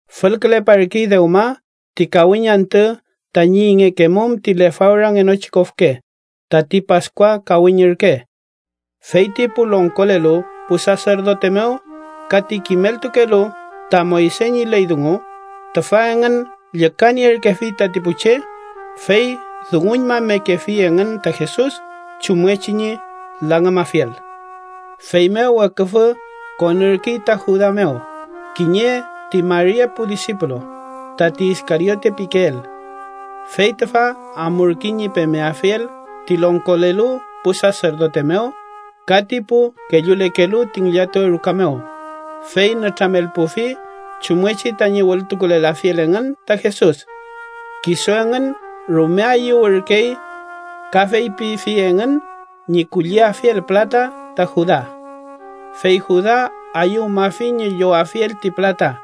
Fülküleparkey dewma ti kawiñ antü tañi ingekemum ti lefawrangenochi kofke, tati Paskua kawiñ ürke. Feyti pu longkolelu pu saserdote mew ka ti kimeltukelu ta Moyse ñi ley dungu, tüfa engün llükanierkefi tati pu che, fey dunguñmamekefi engün ta Jesus chumngechi ñi langümafiel. Feymew weküfü konürkey ta Juda mew, kiñe ti mari epu disipulu, tati Iskariote pikeel. Fey tüfa amurkey ñi pemeafiel ti longkolelu pu saserdote mew ka ti pu kellulekelu ti ngillatuwe ruka mew, fey nütramelpufi chumngechi tañi wültukulelafiel engün ta Jesus. Kisu engün rume ayüwürkey ka feypifi engün ñi kulliafiel pülata ta Juda. Fey Juda ayüwmafi ñi llowafiel ti pülata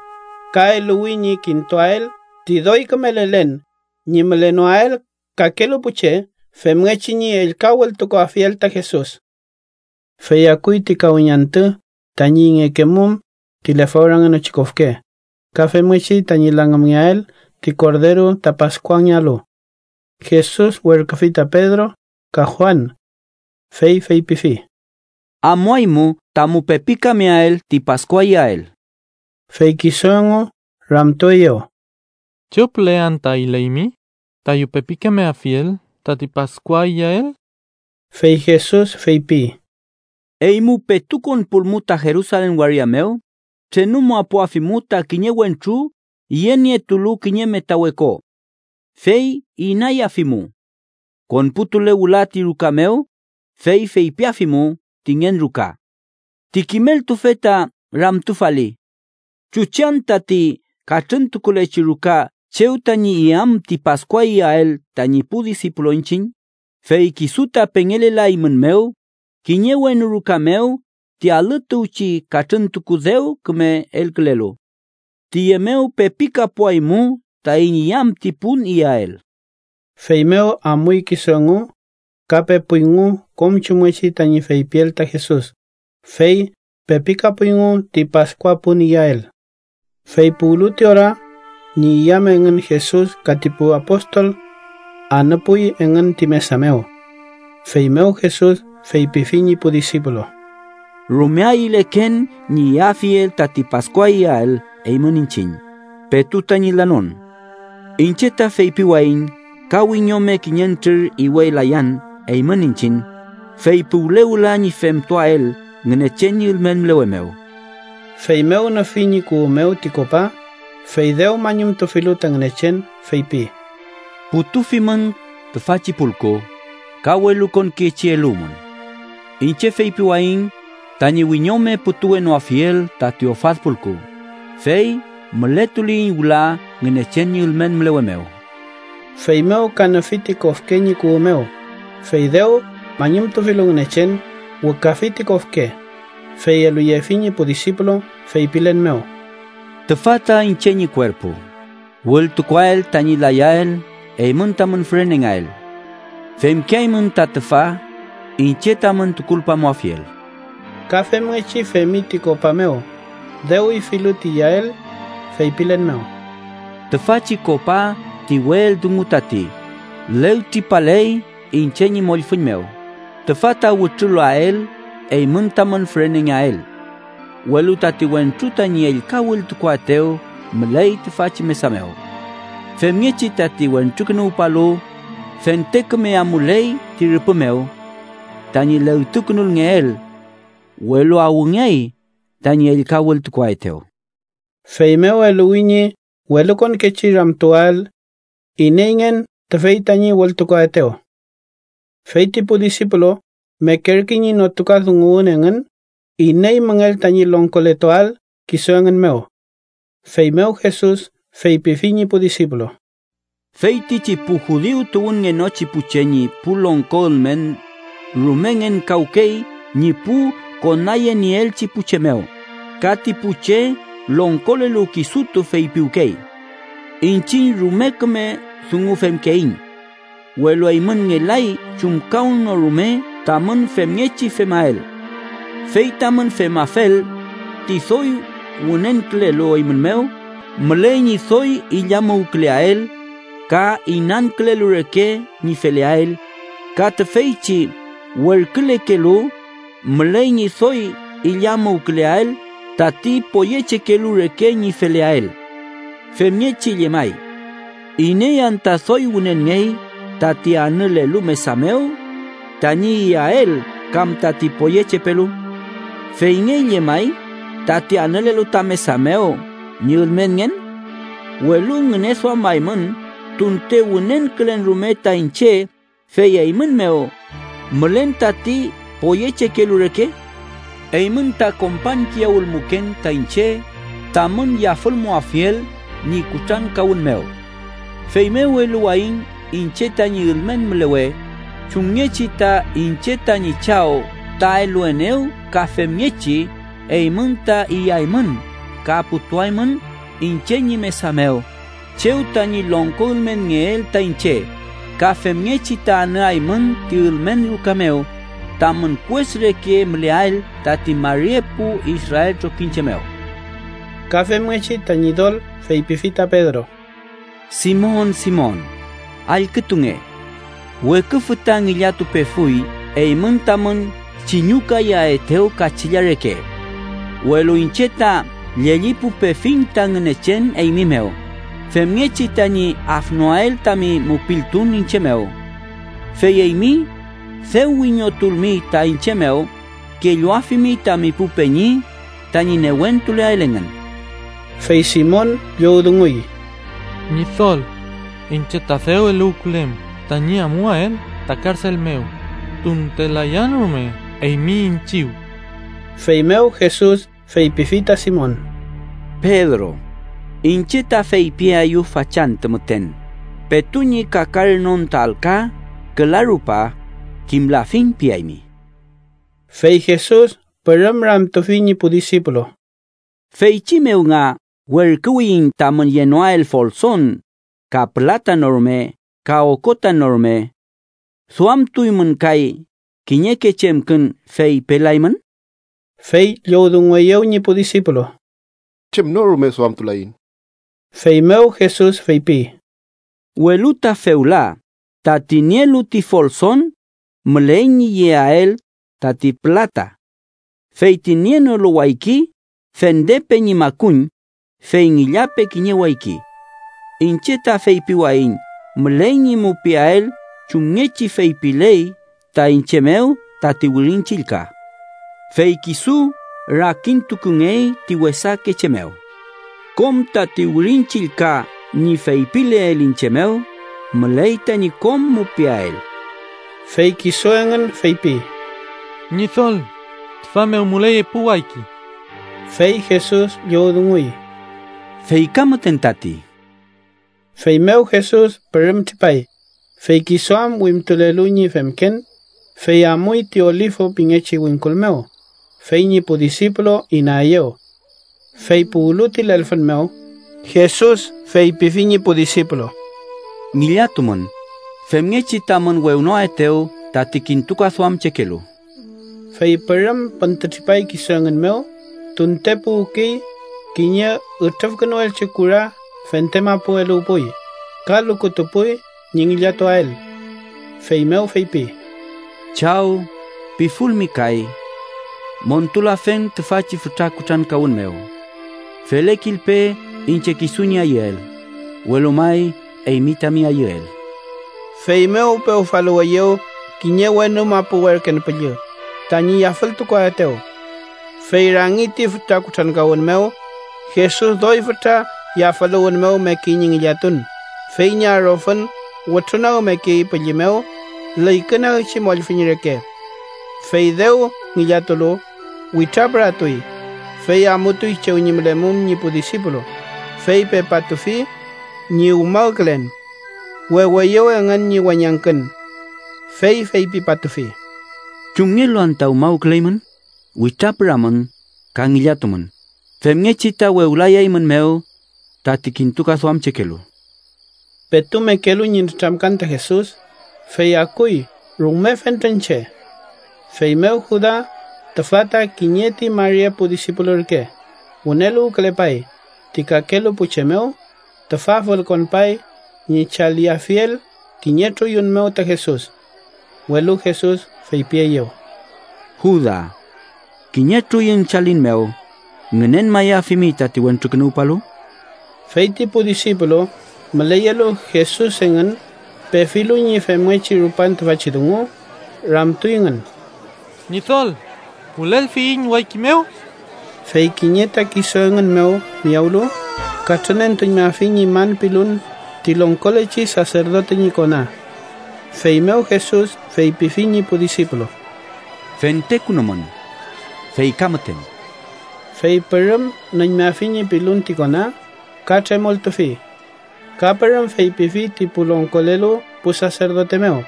ka eluwi ñi kintuael ti doy küme lelen ñi mülenoael kakelu pu che femngechi ñi ellka wültukuafiel ta Jesus. Fey akuy ti kawiñ antü tañi ingekemum ti lefawrangenochi kofke ka femngechi tañi langümngeael ti korderu ta Paskuangealu. Jesus werküfi ta Pedro ka Juan, fey feypifi: —Amuaymu tamu pepikameael ti Paskua iyael. Fey kisu engu ramtueyew: —¿Chew püle anta ayüleymi tayu pepikameafiel tati Paskua iyael? Fey Jesus feypi: —Eymu petu konpulmu ta Jerusalen waria mew, trenumapuafimu ta kiñe wentru yenietulu kiñe metawe ko. Fey inayafimu. Konputule wüla ti ruka mew, fey feypiafimu ti ngen ruka: ‘Ti kimeltufe ta ramtufali: ¿Chuchi anta ti katrüntukulechi ruka chew tañi iyam ti Paskua iyael tañi pu disipulu iñchiñ?’ Fey kisu ta pengelelaeymumew kiñe wenu ruka mew ti alü tuwchi katrüntuku dew küme elkülelu. Tüye mew pepikapuaymu taiñ iyam ti pun iyael. Feymew amuy kisu engu ka pepuyngu kom chumngechi tañi feypiel ta Jesus, fey pepikapuyngu ti Paskua pun iyael. Fey puwlu ti ora, ñi iyam engün Jesus ka ti pu apostol anüpuy engün ti mesa mew. Feymew Jesus feypifi ñi pu disipulu: —¡Rume ayüleken ñi iyafiel tati Paskua iyael eymün iñchiñ petu tañi lanon! Iñche ta feypiwayiñ ka wiñome kiñentrür iwelayan eymün iñchiñ, fey puwle wüla ñi femtuael Ngünechen ñi ülmen mülewe mew. Feymew nüfi ñi kuwü mew ti kopa, fey dew mañumtufilu ta Ngünechen, feypi: —Putufimün tüfachi pulku ka welukonkechi eluwmün. Iñche feypiwayiñ tañi wiñome putuwenoafiel tati ofad pulku, fey mületuliyiñ wüla Ngünechen ñi ülmen mülewe mew. Feymew ka nüfi ti kofke ñi kuwü mew, fey dew mañumtufilu Ngünechen, wükafi ti kofke, fey eluyefi ñi pu disipulu feypilen mew: —Tüfa ta iñche ñi kuerpu, wültukuael tañi layael eymün tamün fürenengeael. Femkeaymün ta tüfa iñche tamün tukulpamuafiel. Ka femngechi femi ti kopa mew, dew ifilu ti iyael, feypilen mew: —Tüfachi kopa ti we eldungu tati, legtripaley iñche ñi mollfüñ mew, tüfa ta wütrulael eymün tamün fürenengeael. Welu tati wentru tañi ellka wültukuaetew müley tüfachi mesa mew. Femngechi tati Wentrukünuwpalu fente küme amuley ti rüpü mew tañi legtukünulngeel, welu ¡awngeay tañi ellka wültukuaetew! Feymew eluwi ñi welukonkechi ramtuwael ineyngen tüfey tañi wültukuaetew. Fey ti pu disipulu mekerkey ñi notukadunguwün engün iney müngell tañi longkoletuael kisu engün mew. Feymew Jesus feypifi ñi pu disipulu: “Feytichi pu judiu tuwünngenochi pu che ñi pu longko ülmen rume ngenkawkey ñi pu konayenieelchi pu che mew, ka ti pu che longkolelu kisutu feypiwkey: ‘iñchiñ rume küme dungu femkeiñ.’ Welu eymün ngelay chumkawnorume tamün femngechi femael. Fey tamün femafel, ti doy wünenkülelu eymün mew müley ñi doy illamuwküleael ka inankülelu reke ñi feleael, ka tüfeychi werkülekelu müley ñi doy illamuwküleael tati poyechekelu reke ñi feleael. Femngechi llemay: ¿Iney anta doy wünenngey tati anülelu mesa mew tañi iyael kam tati poyechepelu? ¿Feyngey llemay tati anülelu ta mesa mew ñi ülmenngen? ¿Welu ngüneduamaymün tunte wünenkülen rume ta iñche fey eymün mew mülen tati poyechekelu reke? “Eymün ta kompañkiyawülmuken ta iñche tamün yafülmuafiel ñi kutrankawün mew. Feymew eluwayiñ iñche tañi ülmen mülewe, chumngechi ta iñche tañi Chaw ta eluenew ka femngechi eymün ta iyaymün ka putuaymün iñche ñi mesa mew chew tañi longko ülmenngeel ta iñche, ka femngechi ta anüaymün ti ülmen ruka mew, tamün kues reke müleael tati mari epu Israel trokiñche mew.” Ka femngechi ta Ñidol feypifi ta Pedro: —Simon, Simon, allkütunge. Weküfü ta ngillatupefuy eymün tamün chiñükayaetew kachilla reke. Welu iñche ta llellipupefiñ ta Ngünechen eymi mew, femngechi tañi afnoael tami mupiltun iñche mew. Fey eymi, dew wiñotulmi ta iñche mew, kelluafimi tami pu peñi tañi newentuleael engün. Fey Simon llowdunguy: —Ñidol, iñche ta dew eluwkülen tañi amuael ta karsel mew tunte layan rume eymi iñchiw. Feymew Jesus feypifi ta Simon: —Pedro, iñche ta feypiaeyu fachantü müten, petu ñi kakaranon ta alka küla rupa, ‘kimlafiñ’ piaymi. Fey Jesus pürüm ramtufi ñi pu disipulu: —Feychi mew nga werküwiyiñ tamün yenoael folson, ka pülata no rume, ka okota no rume ¿duamtuymün kay kiñeke chemkün fey pelaymün? Fey llowdungueyew ñi pu disipulu: —Chem no rume duamtulaiñ. Feymew Jesus feypi: —Welu ta fewla, tati nielu ti folson, müley ñi yeael tati pülata. Fey ti nienolu wayki, fendepe ñi makuñ, fey ngillape kiñe wayki. Iñche ta feypiwayiñ müley ñi mupiael chumngechi feypiley ta iñche mew tati Wirin Chillka: ‘Fey kisu rakintukungey ti wesake che mew.’ Kom tati Wirin Chillka ñi feypileel iñche mew, müley tañi kom mupiael. Fey kisu engün feypi: —Ñidol tüfa mew müley epu wayki. Fey Jesus llowdunguy: —Fey ka müten tati. Feymew Jesus pürüm tripay, fey kisu am wimtulelu ñi femken, fey amuy ti Olifu pingechi wingkul mew, fey ñi pu disipulu inaeyew. Fey puwlu ti lelfün mew, Jesus feypifi ñi pu disipulu: —Ngillatumün, femngechi tamün wewnoaetew tati kintukaduamchekelu. Fey pürüm püntütripay kisu engün mew tunte puwkey kiñe ütrüfkünuelchi kura fente mapu eluwpuy, ka lukutupuy ñi ngillatuael. Feymew feypi: “Chaw, pifulmi kay, montulafen tüfachi fütra kutrankawün mew. Felekilpe iñche kisu ñi ayüel, welu may eymi tami ayüel.” Feymew pewfaluweyew kiñe wenu mapu werken püllü, tañi yafültukuaetew. Fey rangi ti fütra kutrankawün mew, Jesus doy fütra yafüluwün mew mekey ñi ngillatun fey ñi arofün wütrunagmekey pülli mew lüykünagchi mollfüñ reke. Fey dew ngillatulu, witrapüratuy, fey amutuy chew ñi mülemum ñi pu disipulu, fey pepatufi ñi umawkülen. Weweyew engün ñi weñangkün. Fey feypipatufi: —¿Chumngelu anta umawküleymün? Witrapüramün ka ngillatumün, femngechi ta wewlayaeymünmew tati kintukaduamchekelu. Petu mekelu ñi nütramkan ta Jesus, fey akuy rume fentren che. Feymew Juda tüfa ta kiñe ti mari epu disipulu ürke, wüneluwkülepay ti kakelu pu che mew. Tüfa fülkonpay ñi chaliafiel kiñe truyun mew ta Jesus. Welu Jesus feypieyew: —Juda, ¿kiñe truyun chalin mew ngünenmayafimi tati Wentrukünuwpalu? Fey ti pu disipulu müleyelu Jesus engün, pefilu ñi femngechi rupan tüfachi dungu, ramtuyngün: —Ñidol ¿wülelfiyiñ wayki mew? Fey kiñe ta kisu engün mew miyawlu, katrünentuñmafi ñi man pilun ti longkolechi saserdote ñi kona. Feymew Jesus feypifi ñi pu disipulu: —Fentekünumün. Fey ka müten. Fey pürüm nüñmafi ñi pilun ti kona, ka tremoltufi. Ka pürüm feypifi ti pu longkolelu pu saserdote mew,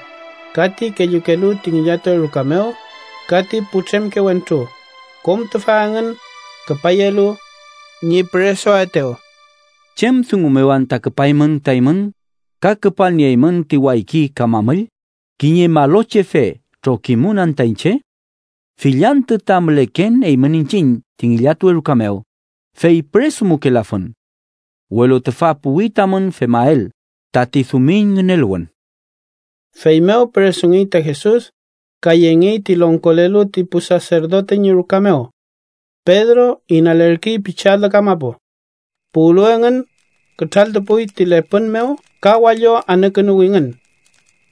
ka ti kellukelu ti ngillatuwe ruka mew ka ti putremke wentru, kom tüfa engün küpayelu ñi püresuaetew: —¿Chem dungu mew anta küpaymün ta eymün ka küpalnieymün ti wayki ka mamüll? ¿Kiñe malochefe trokimun anta iñche? Fill antü ta müleken eymün iñchiñ ti ngillatuwe ruka mew, fey püresumukelafun. Welu tüfa puwi tamün femael tati dumiñ ngüneluwün. Feymew püresungey ta Jesus ka yengey ti longkolelu ti pu saserdote ñi ruka mew. Pedro inalerkey pichi alü kamapu. Puwlu engün, kütraltupuy ti lepün mew ka wallo anükünuwingün.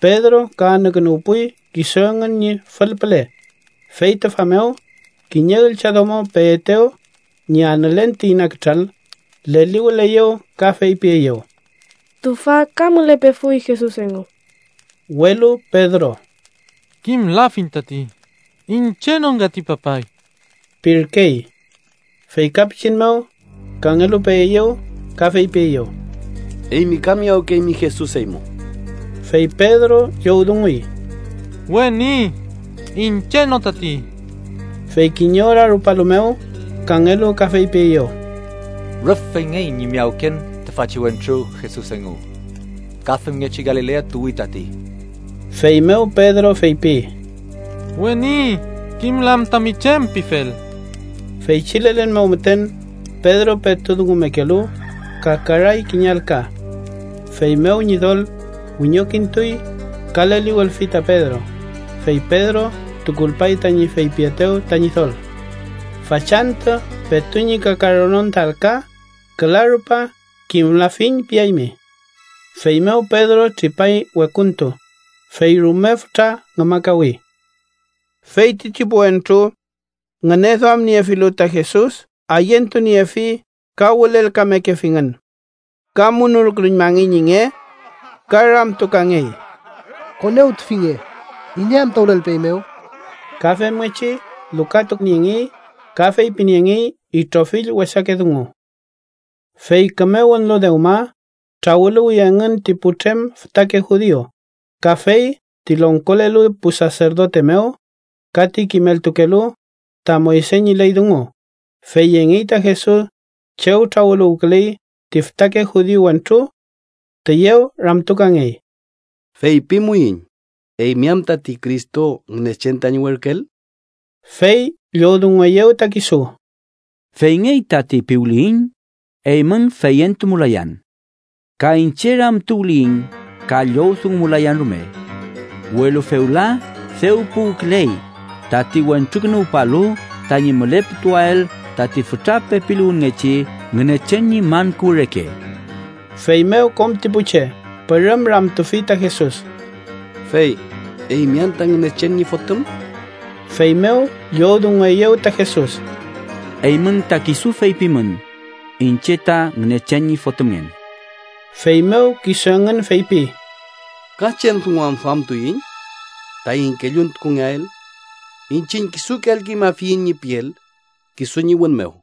Pedro ka anükünuwpuy kisu engün ñi fül püle. Fey tüfa mew, kiñe üllchadomo peetew ñi anülen ti ina kütral, leliwüleyew ka feypieyew: —Tüfa ka mülepefuy Jesus engu. Welu Pedro: —Kimlafiñ tati. Iñche no ngati, papay ―pirkey. Fey ka pichin mew, kangelu peeyew ka feypieyew: —Eymi ka miyawkeymi Jesus eymu. Fey Pedro llowdunguy: —Weni, iñche no tati. Fey kiñe ora rupalu mew, kangelu ka feypieyew: —Rüf feyngey ñi miyawken tüfachi wentru Jesus engu. Ka femngechi Galilea tuwi tati. Feymew Pedro feypi: —Weni, kimlan tami chem pifel. Feychi lelen mew müten, Pedro petu dungumekelu, kakaray kiñe alka. Feymew Ñidol wiñokintuy ka leliwülfi ta Pedro, fey Pedro tukulpay tañi feypietew ta Ñidol: “Fachantü petu ñi kakaranon ta alka, küla rupa ‘kimlafiñ’ piaymi.” Feymew Pedro tripay wekuntu, fey rume fütra ngümakawi. Feytichi pu wentru ngüneduamniefilu ta Jesus ayentuniefi ka wülelkamekefingün. Ka munulkünuñmangey ñi nge ka ramtukangey: —¡Konewtufinge iney anta wülelpeeymew! Ka femngechi lukatuniengey ka feypiniengey itrofill wesake dungu. Fey küme wünlu dewma, trawüluwi engün ti putrem fütake judiu, ka fey ti longkolelu pu saserdote mew ka ti kimeltukelu ta Moyse ñi ley dungu, fey yengey ta Jesus chew trawüluwküley ti fütake judiu wentru. Tüyew ramtukangey: —Feypimuiñ, ¿eymi am tati Cristo, Ngünechen tañi werküel? Fey llowdungueyew ta kisu: —‘Feyngey tati’ piwliyiñ, eymün feyentumulayan. Ka iñche ramtuwliyiñ, ka llowdungumulayan rume. Welu fewla dew puwküley tati Wentrukünuwpalu tañi müleputuael tati fütra pepiluwünngechi Ngünechen ñi man kuwü reke. Feymew kom ti pu che pürüm ramtufi ta Jesus: —Fey, ¿eymi anta Ngünechen ñi Fotüm? Feymew llowdungueyew ta Jesus: —Eymün ta kisu feypimün iñche ta Ngünechen ñi Fotümngen. Feymew kisu engün feypi: —¿Ka chem dungu am duamtuiñ taiñ kelluntukungeael? Iñchiñ kisuke allküñmafiyiñ ñi piel, kisu ñi wün mew.